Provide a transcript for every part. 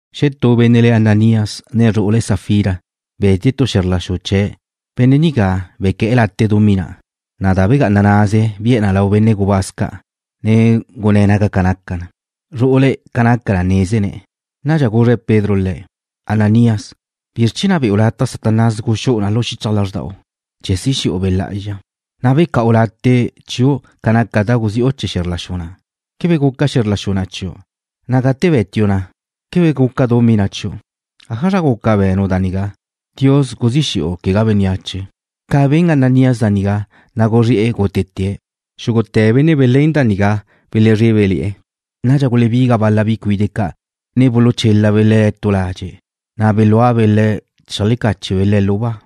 Xetú benne' le̱' Ananías nen zru'ule̱' Safira, be̱tie̱' tu xe̱zr la xu chee̱'. Benne' nigá bequé̱'e̱ late' dumí na', na' da begá'anaze bi'e̱ lau benne' gubáz ca', ne gunné̱' ca naca na'. Zru'ule̱' ca naca na nézene̱'. Nadxa guzre Pedro le̱': ―Ananías, ¿bizr chee̱ na' be̱'u lataj Satanás guxú'u na lu xichaj lázrda'u chee̱ si xe̱'u Be' Lá'azxa, na' beca'u late' chiu' ca naca da guzi'u chee̱ xe̱zr la xu na'? ¿Quebe guca xe̱zr la xu na' chiu'? Na' gate be̱tiu' na, ¿quebe guca dumí na' chiu'? ¿Ájazra guca be̱nu' da nigá? Dios guzí xe̱'u, quegá bénneache. Ca ben Ananías da nigá, na' guzré'e̱ gútete̱'. Xúgute̱ benne' belén da nigá belezrébele̱'e̱. Nadxa gulebiga bal-la bi cuide' ca', ne buluchélabe' le̱' tu ladxe', na' belúabe' le̱' cheajlecáchebe' le̱' lu ba.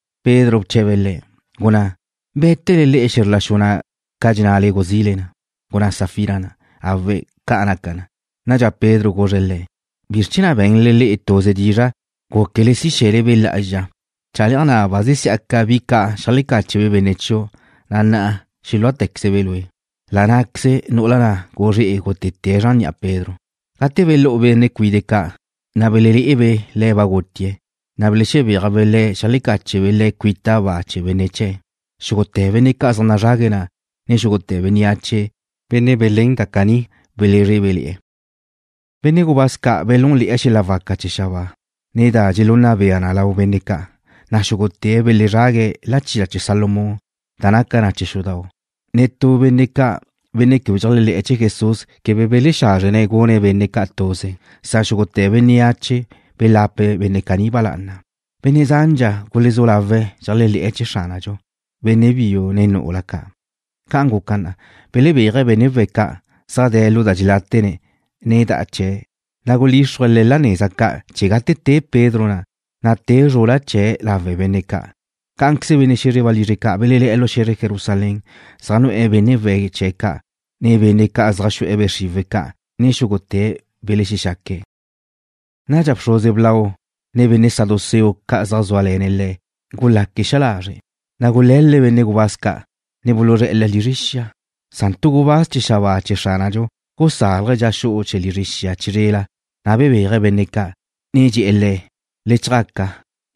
Pedro bche̱be̱' le̱': ―Gunná, ¿bé̱tele le'e xe̱zr la xu na' ca dxennale guzile na? Gunná Safira na': ―Awe', ca naca na'. Nadxa Pedro guzre̱' le̱': ―¿Bizr chee̱ na' be̱nle le'e tuze dizra' gúquele si xe̱le Be' Lá'azxa? Chale'aj na' ba zesí'aca bi ca' xeajlecáchebe' benne' chiu', na' na'a xelúatequezebe' lue'. La' ná'queze nu'ula na' guzré'e̱ gútete̱' zran ni'a Pedro. Gate belú'u benne' cuide' ca', na' belelé'ebe' le̱' ba gutie̱', na' belexebéajbe' le̱' xeajlecáchebe' le̱' cuita ba chee̱ benne' chee̱'. Xúgute̱ benne' ca' zaj nazrague̱' na', ne xúgute̱ bénneache, benne' belén da caní belezrébele̱'e̱. Benne' gubáz ca' belúnle̱'e̱ xel-la' waca chee̱ xabáa, ne da dxelunna bea na lau benne' ca', na' xúgute̱' belezrague̱' La Chila Chee̱ Salomón, da naca na chee̱ xudau'. Netú benne' ca', benne' quebe dxeléajle̱'e̱ chee̱ Jesús, quebe belexázrene̱' gune̱' benne' ca' tuze, san xúgute̱ bénneache belape̱' benne' caní ba lá'ana. Benne' zandxa gulezú lawe̱' dxeléajle̱'e̱ chee̱ Xránadxu, benne' biu ne nu'ula ca'. Ca' guca na, belebéaje̱' benne' we̱' ca', zaj de̱' lu da dxeláta'ne̱', ne da'a chee̱', na' gulíxrue̱' le̱' la neza ca' chee̱ gate te Pedro na', na' te zrula chee̱' lawe' benne' ca'. Cá'anqueze benne' xe̱zre walizre ca' belelé̱'e̱ lu xe̱zre Jerusalén, zaj nu'e̱ benne' we̱' chee̱' ca', ne benne' ca' zaj xu'e̱ be' xriwe̱' ca', na' xúgute̱' belexexaque̱'. Nadxa bxruze blau, ne benne' saduceo ca' zaj zúale̱ne̱' le̱', gulaque̱' xa lazre', na' gule̱l-le̱' benne' gubáz ca', ne buluzré̱'e̱ le̱' lizre xia. Na' tu gubáz chee̱ xabáa chee̱ Xránadxu gusálaje̱' dxa xu'u chee̱ lizre xia na' chizrela, na' bebéaje̱' benne' ca', ne dxe̱'e̱ le̱': ―Le chjaca,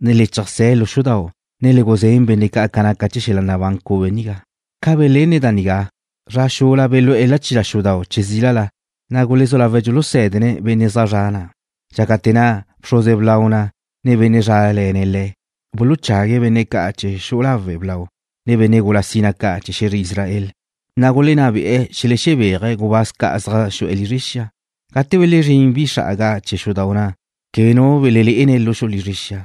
ne le cheajsé̱ lu xudau', ne le guzén benne' ca' ca naca chee̱ xel-la' nabán cube nigá. Ca belenne̱' da nigá, zra xula belú'e̱ chila xudau' che zílala, na' gulezú lawe̱' dxulusé̱dene̱' benne' zaj zre̱'e̱ na'. Dxácate̱ na', bxruze blau na', ne benne' zrále̱ne̱' le̱', buluchague̱' benne' ca' chee̱ xu'u lawe' blau, ne benne' gula sina ca' chee̱ xe̱zre Israel, na' gulenná be'e̱ xelexebéaje̱' gubáz ca' zaj xu'e̱ lizre xia. Gate belezrín bi xra'aga chee̱ xudau' na', quebe nu belelé'ene̱' lu xu'u lizre xia,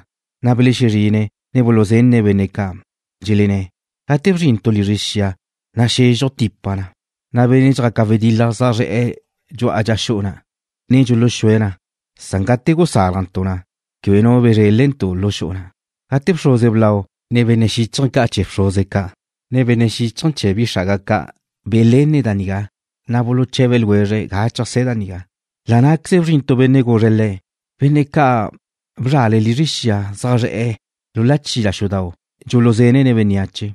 na' belexezrine̱', ne buluzenne̱' benne' ca', dxelenné̱': ―Gate bzrintu' lizre xia na', naxezxuj tipa na, na' benne' dxjaque̱' wedil-la zaj zre̱'e̱ dxu'a dxa xu'u na', ne dxuluxúe̱' na, san gate gusálajntu' na, quebe nu bezrélentu' lu xu'u na'. Gate bxruze blau, ne benne' xíchaje̱ ca' chee̱ bxruze ca', ne xíchaje̱ chee̱ bi xra'aga ca', belenne̱' da nigá, na' buluche̱be ljwezre̱' ga cheajsé̱ da nigá. La' ná'queze bzrin tu benne' guzre̱' le̱': ―Benne' ca' bzra'le le'e lizre xia zaj zre̱'e̱ lu chila xudau', dxulusé̱dene̱' bénneache.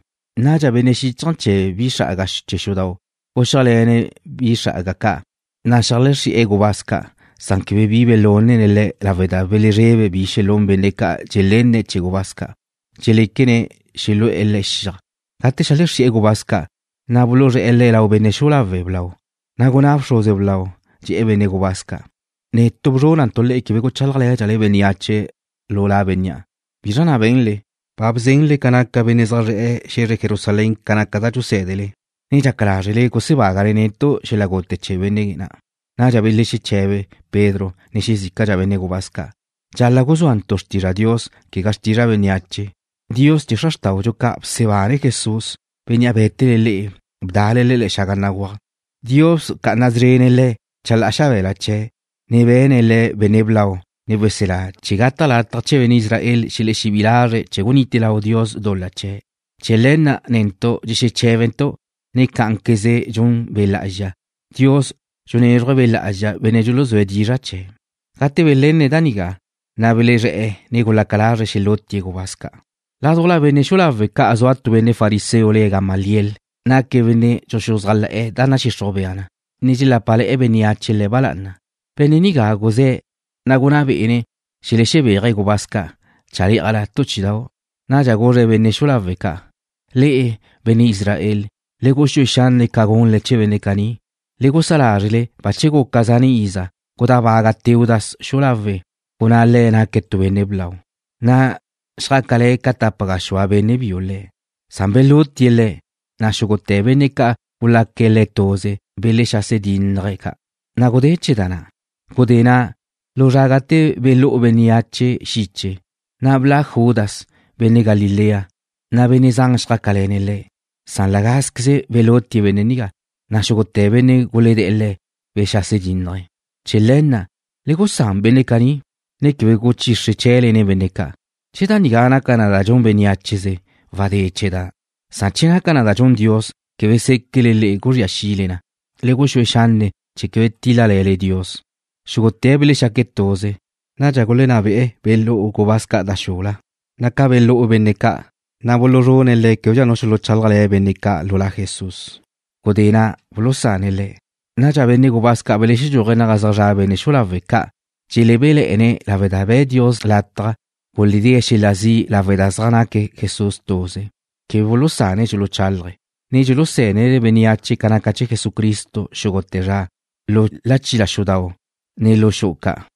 Nadxa benne' xíchaje̱ chee̱ bi xra'aga chee̱ xudau' guxíajle̱ne̱' bi xra'aga ca', na' xeajlexrí'e̱ gubáz ca'. Quebe bi belúnene̱' le̱' lawe' da belezrebe̱' bi xelún benne' ca' dxelenne̱' chee̱ gubáz ca', lawe' da dxeléquene̱' xelu'e̱ le̱' xiaj. Gate xeajlexrí'e̱ gubáz ca', na' buluzré̱'e̱ le̱' lau benne' xu'u lawe' blau, na' gunná bxruze blau na', dxe̱'e̱ benne' gubáz ca': ―Netu' bzrúnantu' le'e quebe guchálajle̱dxale bénneache lu la bénnea'. ¿Bizra na' be̱nle? Ba bzenle ca naca benne' zaj zre̱'e̱ xe̱zre Jerusalén ca naca da dxusé̱dele, ne dxaca lázrele gusebágale netu' xel-la' gute chee̱ benne' na'. Nadxa belexeche̱be Pedro, ne xezícadxa benne' gubáz ca': ―Dxala' guzúantu' xrtizra' Dios, quegá xrtizra' bénneache. Dios chee̱ xra xrtáudxu ca' bsebane̱' Jesús, Bénnea' bé̱tele le'e bda'ale Le̱' xaga béguaj. Dios bca'ana szrene̱' Le̱' chalá'a xabe̱la chee̱', ne be̱ne̱' Le̱' Benne' Blau, ne Weselá, chee̱ gata' lataj chee̱ benne' Israel xelexebí'i lazre̱' chee̱ gunite lau Dios dul-la chee̱'. Chee̱ le̱ na' netu' dxexeché̱bentu', ne cá'anqueze dxun Be' Lá'azxa. Dios dxunézruje̱' Be' Lá'azxa benne' dxuluzúe̱' dizra' chee̱'. Gate belenne̱' da nigá, na' belezré̱'e̱, ne gulaca lazre̱' xelútie̱' gubáz ca'. Ládujla benne' xu'u lawe' ca' zua tu benne' fariseo le̱' Gamaliel. Naque̱' benne' dxuxuzájle̱'e̱ da nadxixruj bea na, na' dxelápale̱'e̱ bénneache le̱' ba lá'ana. Benne' nigá guzé̱', na' gunná bé'ene̱' xelexebéaje̱' gubáz ca' chalé'ajla tu chí'idau'. Nadxa guzre̱' benne' xu'u lawe' ca': ―Le'e, benne' Israel, le guxúe xanne' ca gunle chee̱ benne' caní. Le gusá lazre', bache guca zane' iza, gudábaga Teudas xu'u lawe', gunné̱' naque̱' tu benne' blau, na' xjácale̱ ca tapa gaxúa benne' biu le̱'. Na' belutie̱' le̱', na' xúgute̱ benne' ca' gulaca le̱' tuze belexase dinnaje̱' ca', na' gudé chee̱ da na'. Gudé na', lu zra gate belú'u bénneache xiche, na' bla' Judas, benne' Galilea, na' benne' zan xjácale̱ne̱' le̱'. Cá'anqueze belutie̱' bénnea', na' xúgute̱ benne' gulede̱'e̱ le̱' belexase dínnaje̱'. Chee̱ le̱ na', le gusán benne' caní, ne quebe guchixre chee̱le nen benne' ca'. Che da nigá naca na da dxun beneácheze, wadé chee̱ na. Che naca na da dxun Dios, quebe séquele le'e guzría xile na. Le guxúe xanne' chee̱ quebe tíl-lale̱le Dios. Xúgute̱' belexaque̱' tuze. Nadxa gulenná be'e̱ belú'u gubáz ca' da xula, na' ca belú'u benne' ca', na' buluzrune̱' le̱' québedxa nu xuluchálajle̱ benne' ca' lu La Jesús. Gudé na' bulusane̱' le̱'. Na' benne' gubáz ca' belexedxúaje̱' naga zaj zra' benne' xu'u lawe' ca', dxelebéle̱'e̱ne̱' lawe' da be̱' Dios lataj guledée̱' xel-la' zi' lawe' da zaj naque' Jesús tuze. Quebe bulusane̱' dxuluchálaje̱', ne dxulusé̱dene̱' bénneache ca naca chee̱ Jesucristo xúgute̱ zra, lu chila xudau', ne lu xu'u ca'.